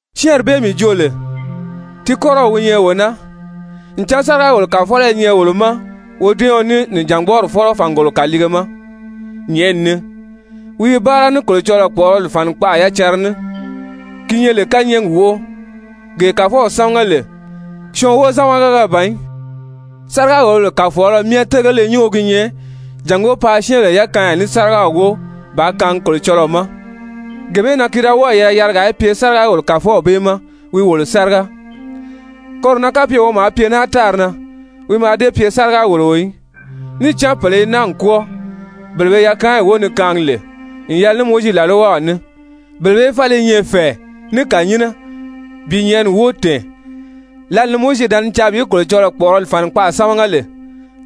Syɛ́ɛnri bee mii joo lè, ti kɔ́rɔw wi nyɛ wee naa, ncan sáriga-wòlobèle kàfɔlɔ i nyɛ wolo ma wodɛ́ɛɔn ní Nìjangbɔɔri Fɔ́lɔ fàngolo kàliige ma nyɛ̀ʔɛni ni. Wi i báara ní Kolocɔlɔɔ kpɔ̀ʔɔrɔli fànikpaʔa yacanra ní, ki lè kányɛɛgi wóʔo, gee Kàfɔw sámaga lè, syɔɔn wozamagaga ban í. Sáriga-wòlobèle kàfɔlɔ myɛ télegele nyúngo gi nyɛ jàngó paa syɛ́ɛnbèle yakaanya ní sárigaw wóo bàā kaangi Kolocɔlɔɔ ma. Gee bee na ki da wɔ́ɔ̀ yɛlɛ yarigaa í pye sáriga-wòlobèle kàfɔlɔ bee ma wi wòlo sáriga. Koro na kapye wi maa pye naa tári na wi mǎà dée pye sáriga-wòloo í, níì cán pèle i naa n kwɔ́ɔ, bele be yakaanyi wóo ni kaangi lè n yɛlɛ ní Mowizi làlwaw ní. Bele bee fáli i nyɛ fɛ̀ɛ ní kànyinnɛ bi nyɛ̀ʔɛni wóo tɛ̀ɛn, lǎli ni Mowizi da ni caa bi Kolocɔlɔɔ kpɔ̀ʔɔrɔli fànikpaʔa sámaga lè,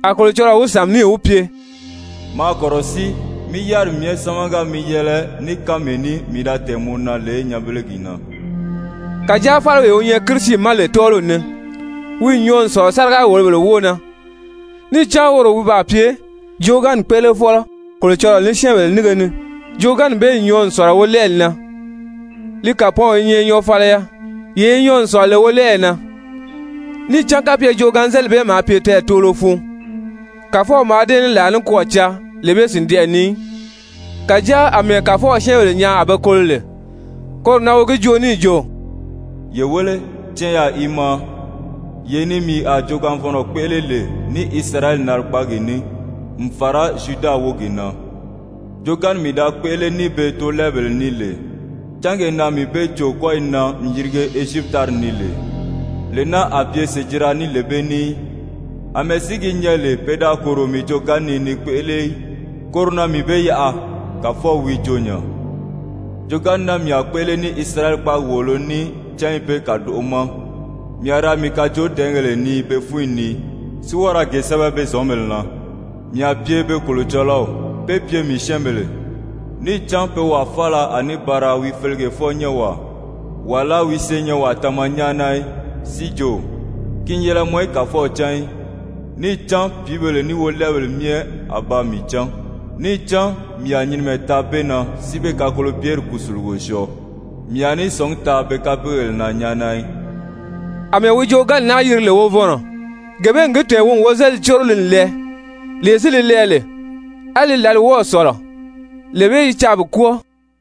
a Kolocɔlɔɔ wi sàmi níì wi pye: «Maa kɔ̀rɔsíi mí yáriri myɛ sámaga mi yɛlɛ ní kánmee ní mii da tɛ̀ɛn mɔ na lè nyanbelegi na.» Kàjáa fáliwee wi nyɛ Kirisi ma lè tɔ́ɔliw ni, wi n nyɔɔ n sɔ̀lɔ sáriga-wòlobèle wóo na, níì cán woro wi baa pye joogaanni kpéʔelefɔlɔ Kolocɔlɔɔ ní syɛ́ɛnbèle nínge ni, joogaanni bee n nyɔɔ n sɔ̀lɔ wolɛɛli na, li kàpɔɔnw i nyɛ nyɔɔfaliya, yee yi nyɔɔ n sɔ̀lɔ lè wolɛɛyi na. Níì cán kapye joogaanzelili bee maa pye tɛɛtoolo fun, Kàfɔw mǎà dée ní làa nikwɔɔ caa lee bee sìndɛʔɛ ni í. Kàjáa àmɛɛ Kàfɔw syɛ́ɛnbèle nyaa a be kolo lè, koro na wi gi joo níì jo: «Ye wéle, canyaa i maa, yee ni mii a joogaanvɔnnɔ kpéʔele lè ní Isirayɛli narigbaagi ní, n fàra Zyuda wógi na. Joogaanni mii da kpéʔele ní be toolɛɛbèle ní lè, cángee na mii be cò kɔ́yi na n yirige Ezyipiti tári ni lè, lee naa a pye sèjira ní lee bee ní í. Amɛɛ si gi nyɛ lè pe da kòro mii joogaanni ni ni li kpéʔele í, koro na mii be yaʔa, Kàfɔw wi joo nya. Joogaanni naa mii a kpéʔele ní Isirayɛli kpáagi wòolo ní cányi bee kàdoʔo ma, mii a ra mii kajoodɛɛngèle nii be fúnyi ni, si wɔ́ɔ ra ge sɛ́bɛ be zɔ̌nbèle na. Mii a pye be Kolocɔlɔw, pé pye mii syɛ́ɛnbèle, níì cán pe wàa faala a ní ba ra wi felegefɔ-nyɛ́nwaa, wàlá wi senyɛnwaa tama nyáana í, si jo: Ki n yɛlɛ mɔ í Kàfɔw cán í. Níì cán pìíbèle ní wolɛɛbèle myɛ a ba mii cán. Níì cán mii a nyinimɛ taa be na si be kakolobyeri kùsulugo syɔɔ, mii a ní sɔ̀ngí taa be kapeegèle na nyáana í. Amɛɛ wi joogaanni naa yiri lè wovɔnnɔ, gee bee n gi tɛ̀ɛn wi n wozelili córo li n lɛɛ. Lee si li lɛɛ lè, á li lǎli wɔ́ɔ̀ sɔ̀lɔ, lee bee i caa bi kwɔ́ɔ.